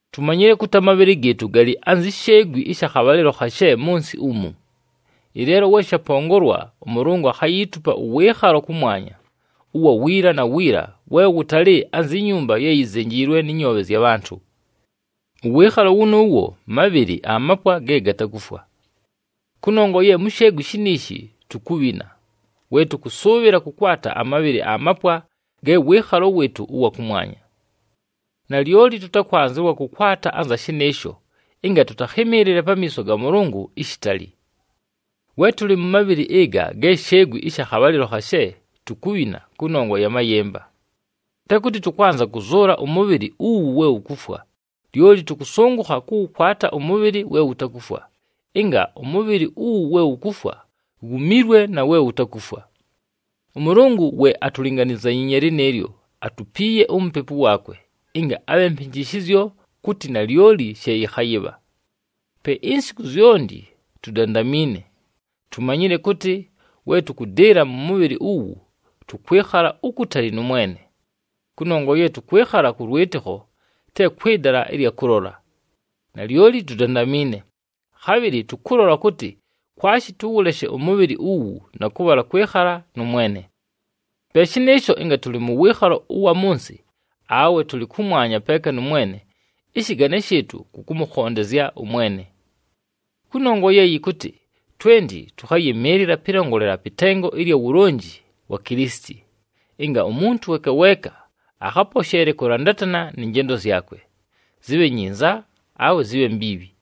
Tumanyile kʉtɨ amabhɨlɨ gɨɨtʉ galɨ anzi sheegwi ɨsha khabhalɨlo khashe mʉ nsɨ umu. Ɨleelo we shapongolwa, ʉMʉlʉngʉ akhayiitupa ʉwɨɨkhalo kʉmwanya, ʉwa wiila na wiila, we wʉtalɨ anzi nyumba ye yizenjiilwe nɨ nyoobhe zya bhantʉ. Ʉwɨɨkhalo wʉnʉʉwo mabhɨlɨ amapwa ge gatakufwa. Kʉnongwa ye mu sheegwi shiniishi tukubhina, we tʉkʉsʉʉbhɨla kʉkwata amabhɨlɨ amapwa ge wɨɨkhalo wɨɨtʉ ʉwa kʉmwanya. Nalyoli tʉkwanzɨwa kʉkwata anza shɨnɨɨsho ɨnga tʉtakhɨmɨɨlɨle pamiiso ga Mʉlʉngʉ ishitali. We tʉlɨ mʉ mabhɨlɨ ɨga ge sheegwi ɨsha khabhalɨlo khashe, tukubhina kʉnongwa ya mayɨmba. Te kʉtɨ tʉkwanza kʉzʉʉla ʉmʉbhɨlɨ uwu we wukufwa, lyoli tʉkʉsʉngʉkha kʉwʉkwata ʉmʉbhɨlɨ we wutakufwa, ɨnga ʉmʉbhɨlɨ uwu we wukufwa wumilwe na we wutakufwa. ɄMʉlʉngʉ we atulinganizanyiinye lɨnɨɨlyo, atupiiye uMupepu waakwe, ɨnga abhe mpɨnjɨshɨzyo kʉtɨ nalyoli she yɨkhayɨbha. Pe insiku zyonti tudandamiine. Tumanyile kʉtɨ, we tʉkʉdɨɨla mʉ mʉbhɨlɨ uwu, tʉkwɨkhala ukutali nʉ Mwene. Kʉnongwa ye tʉkwɨkhala kʉ lwɨtɨkho, te kwɨ dala ɨlya kʉlola. Nalyoli tudandamiine, khabhɨlɨ tʉkʉlola kʉtɨ kwashi tʉwʉleshe ʉmʉbhɨlɨ uwu, na kʉbhala kwɨkhala nʉ Mwene. Pe shɨnɨɨsho, ɨnga tʉlɨ mʉ wɨɨkhalo ʉwa mʉ nsɨ, awe tʉlɨ kʉmwanya peeka nʉ Mwene, ɨshɨgane shɨɨtʉ kʉ kʉmʉkhondezya ʉMwene. Kʉnongwa ye yɨkʉtɨ twenti tʉkhayɨmɨɨlɨla pɨlongolela pɨ tengo ɨlya wulonji wa Kilisiti, ɨnga umuntu weeka weeka akhaposheele kʉlandatana nɨ njendo zyakwe, zɨbhe nyinza awe zɨbhe mbiibhi.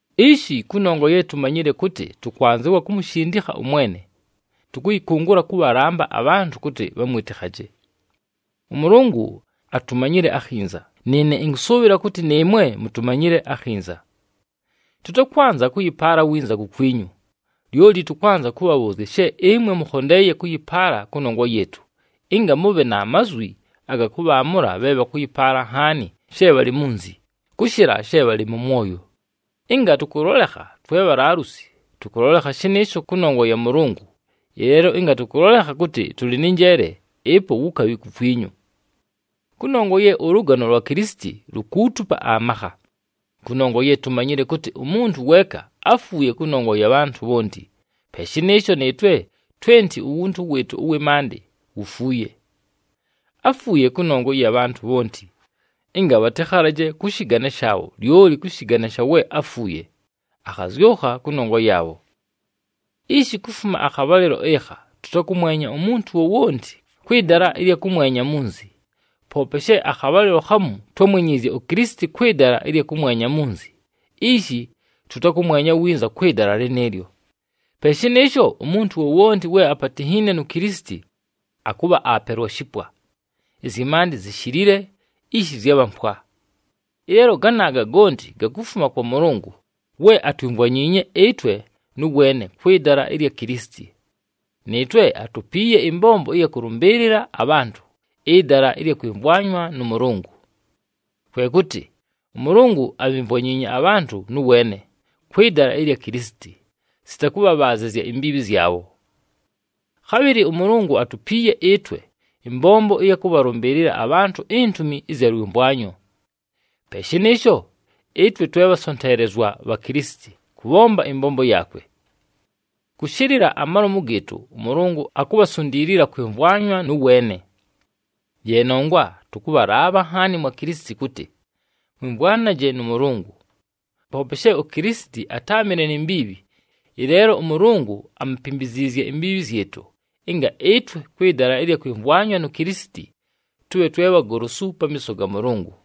Ishi, kʉnongwa ye tumanyile kʉtɨ tʉkwanzɨwa kumushindikha ʉMwene, tʉkʉyɨkʉngʉla kʉbhalamba abhantʉ kʉtɨ bhamwɨtɨkhaje. ɄMʉlʉngʉ atumanyile akhinza, nɨɨne ɨnkʉsʉʉbhɨla kʉtɨ nɨɨmwe mutumanyile akhinza. Tʉtakwanza kʉyɨpaala winza kukwinyu, lyoli tʉkwanza kʉbhabhʉʉzya she ɨmwe mʉkhondeeye kʉyɨpaala kʉnongwa yɨɨtʉ, ɨnga mʉbhe na mazwi aga kʉbhaamʉla bhe bhakʉyɨpaala nhaani she bhalɨ munzi, kʉshɨla she bhalɨ mʉ mwoyo. Ɨnga tʉkʉlolekha twe bhalaalusi, tʉkʉlolekha shɨnɨɨsho kʉnongwa ya Mʉlʉngʉ, ɨleelo ɨnga tʉkʉlolekha kʉtɨ tʉlɨ nɨ njeele, ɨpo wukabhi kukwinyu. Kʉnongwa ye ʉlʉgano lwa Kilisiti lukuutupa amakha, kʉnongwa ye tumanyile kʉtɨ umuntu weeka áfuuye kʉnongwa ya bhantʉ bhonti, pe shɨnɨɨsho nɨɨtwe twenti uwuntu wɨɨtʉ ʉwɨ maandɨ wufuuye. Áfuuye kʉnongwa ɨya bhantʉ bhonti, ɨnga bhatɨkhalaje kʉ shɨgane shaabho, lyoli kʉ shɨgane sha we áfuuye, akhazyʉkha kʉnongwa yaabho. Ishi, kufuma akhabhalɨlo ɨkha, tʉtakʉmwenya umuntu wowonti kwɨ dala ɨlya kʉmwenya munzi, poope she akhabhalɨlo khamu twámwenyiizye uKilisiti kwɨ dala ɨlya kʉmwenya munzi, ishi tʉtakʉmwenya winza kwɨ dala lɨnɨɨlyo. Pe shɨnɨɨsho, umuntu wowonti we apatinhiine nu Kilisiti, akʉbha aapelwa shipwa. Ɨzyɨ maandɨ zishilile, ishi zyabha mpwa. Ɨleelo ganaaga gonti gakufuma kwa Mʉlʉngʉ we atwimvwanyiinye ɨtwe nʉ weene kwɨ dala ɨlya Kilisiti. Nɨɨtwe atupiiye ɨmbombo ɨya kʉlʉmbɨɨlɨla abhantʉ ɨdala ɨlya kwɨmvwanywa nʉ Mʉlʉngʉ. Kwe kʉtɨ ʉMʉlʉngʉ abhimvwanyiinye abhantʉ nʉ weene, kwɨ dala ɨlya Kilisiti, sita kʉbhabhaazɨzya imbiibhi zyabho. Khabhɨlɨ ʉMʉlʉngʉ atupiiye ɨtwe ɨmbombo ɨya kʉbhalʉmbɨɨlɨla abhantʉ intumi ɨzya lwɨmvwanyo. Pe shɨnɨɨsho, ɨtwe twe bhasonteelezwa bha Kilisiti kʉbhomba ɨmbombo yaakwe. Kʉshɨlɨla amalomu gɨɨtʉ ʉMʉlʉngʉ akubhasundiilila kwɨmvwana nʉ weene. Ye nongwa tʉkʉbhalaabha nhaani mwa Kilisiti kʉtɨ, mwɨmvwane nʉ Mʉlʉngʉ. Poope she uKilisiti atáamɨle ni mbiibhi, ɨleelo ʉMʉlʉngʉ amupimbiziizye imbiibhi zyɨtʉ, ɨnga ɨtwe kwɨ dala ɨlya kwɨmvwanywa nu Kilisiti, tʉbhe twe bhagolosu pamiiso ga Mʉlʉngʉ.